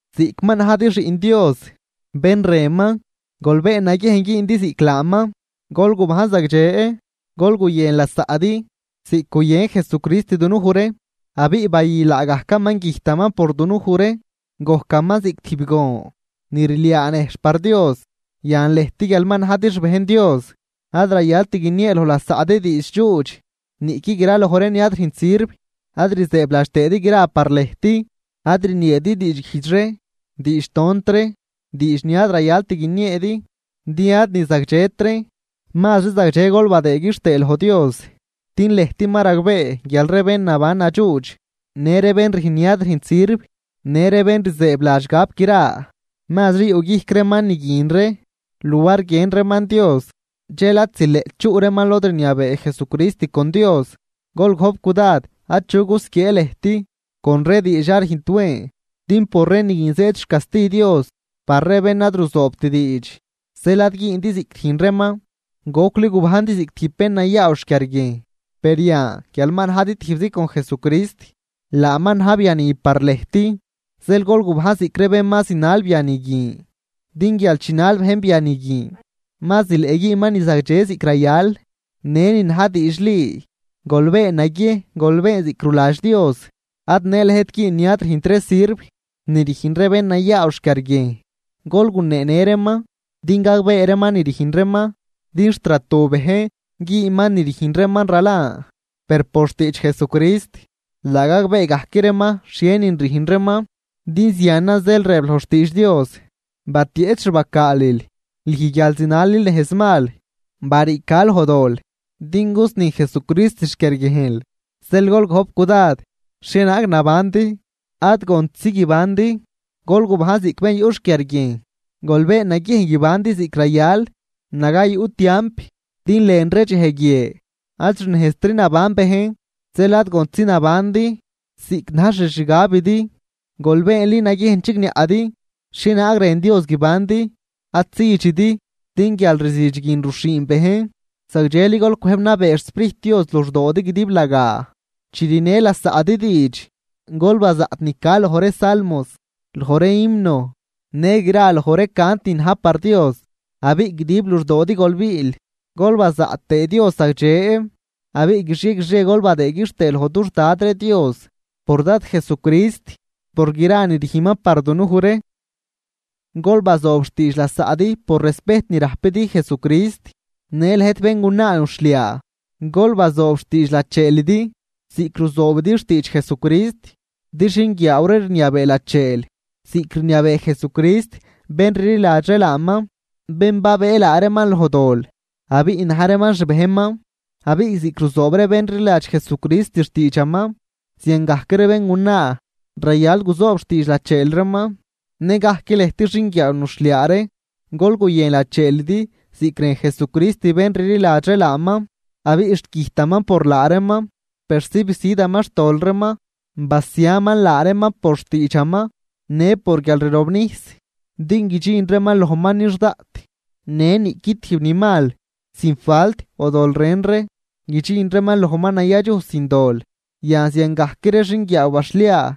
Ziꞌc ma najdi xiꞌn Dios bén rënman, gol been naguiejn güündi ziꞌc laaman. Gol gubajn zagdxe, gol guyën lasaꞌdi ziꞌc guyën Jesucrist dunuj ree abiꞌ bayü laagajcaman güjtaman por dunuj ree, gojcaman ziꞌc tijb gon ni rliaa nejxh par Dios. Yan lëjt guial ma najdi xbejn Dios, ad rayalt guiniee loj lasaꞌdi diidx dxuudx, niꞌqui graloj ree ni ad rüjnt sirv ad rzëëbladx tëëdi gra par lëjt. Ad rnieedi diidxguijdx ree, diidxtont ree, diidx ni ad rayalt guinieedi din ad ni zagdxet reen. Mazri zagdxe gol badëë quixtëë loj Dios. Din lëjt ma ragbee guial ree bén naban nadxuudx në ree bén rüjn ni ad rüjnt sirv, në ree bén rzëëbladx gap gra (mazri yuꞌguijc reeman ni guin ree luar guiën reeman Dios), dxel ad zileꞌt chuꞌ reeman lod rniabee Jesucrist con Dios. Gol gojp cudad achu gusquiee lëjt con ree diidx ad rüjnt wen, din por ree ni guin zëëd xcasti Dios par ree bén ad ruzoobt diidx. Zeel ad güündi ziꞌc rüjn reeman. Gocli gubajndi ziꞌc tijb bén nayaaw xquiarguiejn, per yan guial ma najdi tijbzi con Jesucrist, laaman na̱j biani par lëjt. Zeel gol gubajn ziꞌc ree bén ma zinal biani guin, din guial chinal bejn biani guin ma zileꞌ güünman ni zagdxe ziꞌc rayal, në ni na̱j diidxli. Gol been naguiejn gol been ziꞌc ruladx Dios. Ad në lëjt güün ni ad rüjnt ree sirv ni rüjn ree bén nayaaw xquiarguiejn, gol guneenë reeman din gagbee reeman ni rüjn reeman. Din xt ratu bejn güman ni rüjn reeman ralan. Per por xtiidx Jesucrist laa gagbee gajc reeman xhienin rüjn reeman. Din zianan zeel rëb loj xtiidx Dios: Batieꞌch xbacaalil, lüj guial zinalil nejz mal. Bariica loj dol din gusni Jesucrist xquiarguiejnl. Zeel gol gojp cudad xhienaag nabandi, ad gontzi guibandi, gol gubajn ziꞌc bén yuꞌ xquiarguiejn. Gol been naguiejn guibandi ziꞌc rayal naga yuꞌ tiamp, din lën ree dxej guie ad xnejztri naban bejn. Zeel ad gontzi nabandi ziꞌc na̱j xixgabidi, gol beenli naguiejn chigniaꞌdi xhienaag rën Dios guibandi. Ad südxidi, din guialrzüdx guin ruxhiin bejn. Zagdxeli gol cwëjb nabee xSprijt Dios luxdoodi guidiblagaa. Chi rünë lasaꞌdi diidx, gol bazaꞌt ni ca loj ree salmos, loj ree himno, në gra loj ree cant ni na̱j par Dios. Abiꞌ guidib luxdoodi gol biil gol bazaꞌt tëë Dios zagdxe. Abiꞌ guixie guixie gol badëëd quixtëë loj dux Dad ree Dios por Dad Jesucrist por gra ni rüjnman par dunuj ree. Gol bazoob xtiidx lasaꞌdi por respejt ni rajpidi Jesucrist. Në lëjt béngunaa nuxhliaa, gol bazoob xtiidx lacheelidi ziꞌc ruzoobidi xtiidx Jesucrist. Din xinguiaaw ree rniabee lacheel ziꞌc rniabee Jesucrist bén rliladx ree laaman, bén babëë laa reeman loj dol abiꞌ na̱j reeman xbejnman. Abiꞌ ziꞌc ruzoob ree bén rliladx Jesucrist xtiidxaman, ziangajc ree béngunaa rayal guzoob xtiidx lacheel reeman. Nëgajc lëjt xinguiaaw nuxhliaa ree, gol guyën lacheelidi ziꞌc rën Jesucrist bén rliladx ree laaman, abiꞌ xt güjtaman por laa reeman persi bisüdaman xtol reeman, basiaman laa reeman por xtiidxaman në por guialrirobnijs, din guidxin reeman lojman nix daꞌt në niꞌqui tijb ni mal, sin falt o dol ren ree, guidxin reeman lojman nayadxuj sin dol. Yan ziangajc ree xinguiaaw baxhliaa,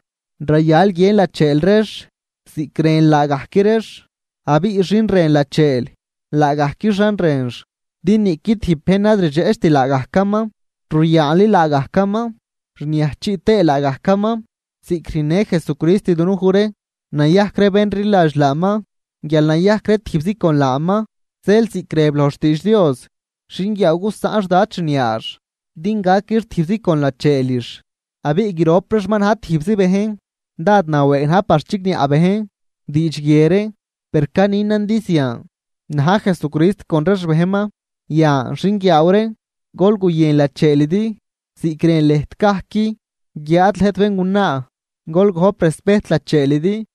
rayal guiën lacheel reex ziꞌc rën laagajc reex. Abiꞌ xin rën lacheel, laa gajquixan rënx. Din niꞌqui tijb bejn ad rdxeꞌcht laagajcaman, ruyaanli laagajcaman rniajchiꞌ tëë laagajcaman ziꞌc rüjnnë Jesucrist dunuj ree nayajc ree bén rliladx laaman guial nayajc ree tijbzi con laaman. Zeel ziꞌc rëb loj xtiidx Dios: “Xinguiaaw gusaꞌn xdad xniaax din gaquix tijbzi con lacheelix abiꞌ grop reex ma na̱j tijbzi bejn.” Dád nawëëg na̱j par chigniaꞌ bejn diidx guie ree, per caninan din zian na̱j Jesucrist con ree xbejnman. Yan, xinguiaaw ree, gol guyën lacheelidi ziꞌc rën lëjt gajc. Guiáad lëjt béngunaa, gol gojp respejt lacheelidi.